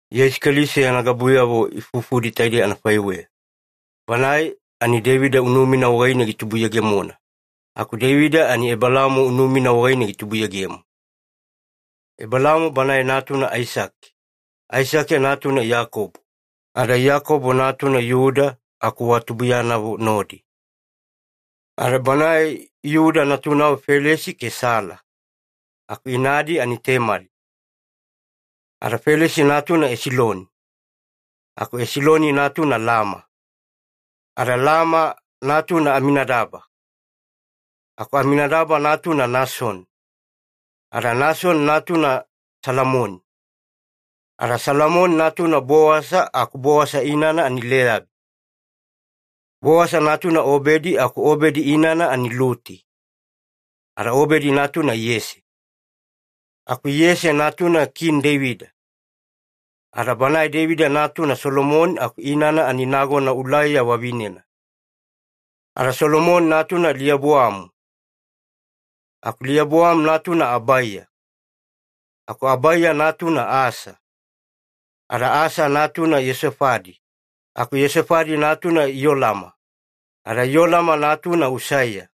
Yeisu Keliso yana gabuyavo ifufudi taidei anafaiweya. Banae ani Deivida unumina wagaine gitubuyegemona, aku Deivida ani Ebelaamo unumina wagaine gitubuyegemo. Ebelaamo banae natuna Aisake, Aisake natuna Iyakobo, ada Iyakobo natuna Iyuda, aku wa tubuiyanavo nodi. Ada banae Iyuda natunavo Felesi ke Sala, aku inadi ani Temali. Ada Felesi natuna Esiloni, aku Esiloni natuna Lama, ada Lama natuna Aminadaba, aku Aminadaba natuna Nasoni, ada Nasoni natuna Salamoni, ada Salamoni natuna Bowasa aku Bowasa inana ani Leyabi. Bowasa natuna Obedi aku Obedi inana ani Luti, ada Obedi natuna Iyese. Aku Iyese natuna Kini Deivida, ada banae Deivida natuna Solomoni aku inana ani nagona Ulaiya vavinena. Ada Solomoni natuna Leoboamu, aku Leoboamu natuna Abaiya, aku Abaiya natuna Asa. Ada Asa natuna Iyeosafadi, aku Iyeosafadi natuna Iyolama, ada Iyolama natuna Usaiya.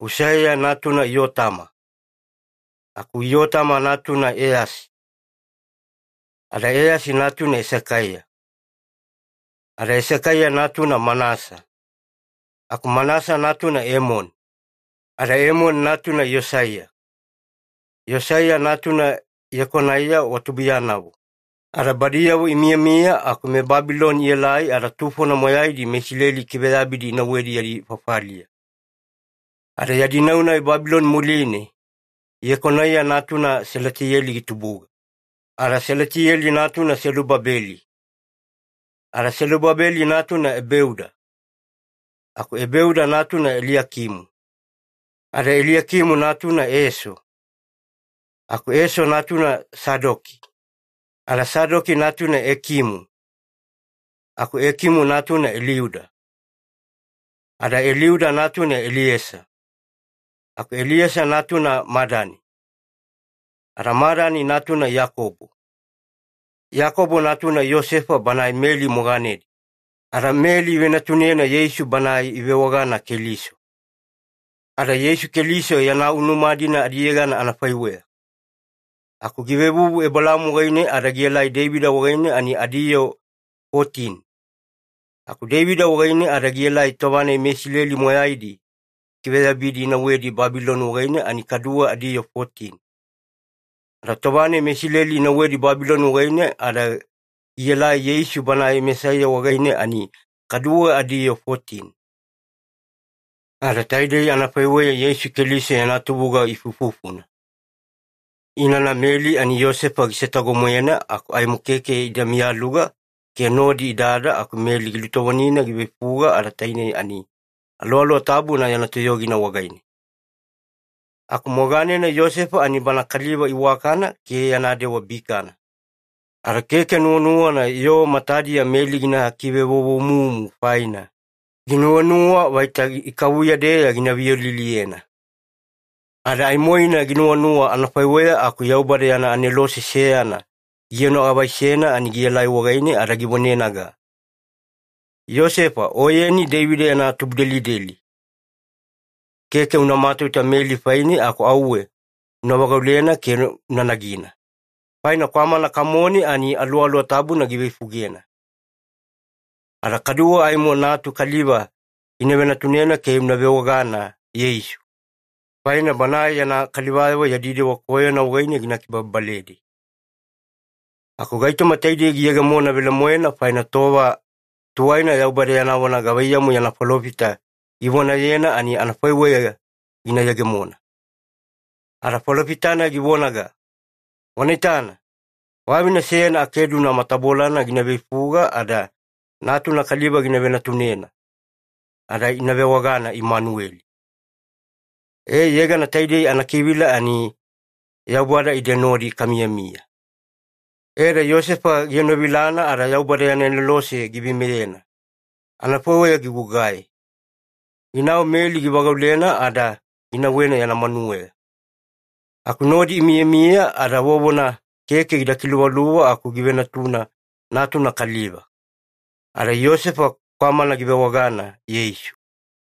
Usaiya natuna Iyotama, aku Iyotama natuna Eyasi, ada Eyasi natuna Esekaiya. Ada Esekaiya natuna Manasa, aku Manasa natuna Emoni, ada Emoni natuna Iyosaiya. Iyosaiya natuna Iyekonaiya wa tubuiyanavo. Ada badiyavo imiyamiya aku meBabiloni ielai ada tufona moyaidi meIsileli ikiveyabidi inauwedi yadi fafaliya. Ada yadi nau-nai Babiloni muline, Iyekonaiya natuna Salatiyeli gitubuga, ada Salatiyeli natuna Selubabeli. Ada Selubabeli natuna Ebeuda, aku Ebeuda natuna Eliakimu, ada Eliakimu natuna Eso, aku Eso natuna Sadoki, ada Sadoki natuna Ekimu, aku Ekimu natuna Eliuda. Ada Eliuda natuna Eliesa, aku Eliesa natuna Madani, ada Madani natuna Iyakobo. Iyakobo natuna Iyosefa banae Meli moganedi, ada Meli ivenatunena Yeisu Banae ivewagana Keliso. Ada Yeisu Keliso yana unuma-dina adiyegana anafaiweya, aku givevuvu Ebelaamo wagaine ada gielai Deivida wagaine ani adiyoo fotini, aku Deivida wagaine ada gielai tova-nai meIsileli moyaidi ikiveyabidi inauwedi Babiloni wagaine ani kaduwe adiyoo fotini. Ada tova-nai meIsileli inauwedi Babiloni wagaine ada gielai Yeisu Banae Mesaiya wagaine, ani kadu adiyoo fotini. Ada taidei anafaiweya Yeisu Keliso yana tubuga ifuifufuna. Inana Meli ani Iyosefa gisetago-moena aku aimo keke ida miyaluga ke nodi idada aku Meli gilutovonina giveifuga, ada tainei ani Aluwaluwa Tabuna yana toyogina wagaine. Aku moganena Iyosefa ani bana kaliva iwakana ke yana dewa bikana, ada keke nuwanuwana yoo matadiya Meli gina kivevovomumu faina, ginuwanuwa vaita ikavuya-deya gina viyoliliyena. Ada aimoina ginuwanuwa anafaiweya aku Yaubada yana anelose seyana gienoavaisena, ani gielai wagaine ada givonenaga, “Iyosefa, oyeni Deivida yana tubudelideli, keke una matauta Meli faine aku auwe una vagaulena ke una nagina, faina kwamana kamone ani Aluwaluwa Tabuna giveifugena. Ada kaduwe aimo natuna kaliva gina venatunena ke una vewagana ‘Yeisu’, faina Banae yana kalivayavo yadi dewa koyona wagaine gina kibababaledi.” Aku gaitoma taidei giyegemona velemoena, faina tova tuwaina Yaubada yana vona gavaiyamu yana falofita givonayena ani anafaiweya gina yegemona. Ada falofita-nai givonaga, “Wana itana, vavine seyana akeduna matabolana gina veifuga ada natuna kaliva gina venatunena, ada ina vewagana Imanueli.” E, yegana taidei anakivila ani ‘Yaubada ide nodi kamiyamiya’. E ada Iyosefa gienovilana ada Yaubada yana anelose giveimeyena anafaiweya gigugai. Ginau Meli givagaulena ada ginauwena yana manuweya. Aku nodi imiyamiya ada vovona keke gida kiluvaluva aku givenatuna natuna kaliva. Ada Iyosefa kwamana givewagana Yeisu.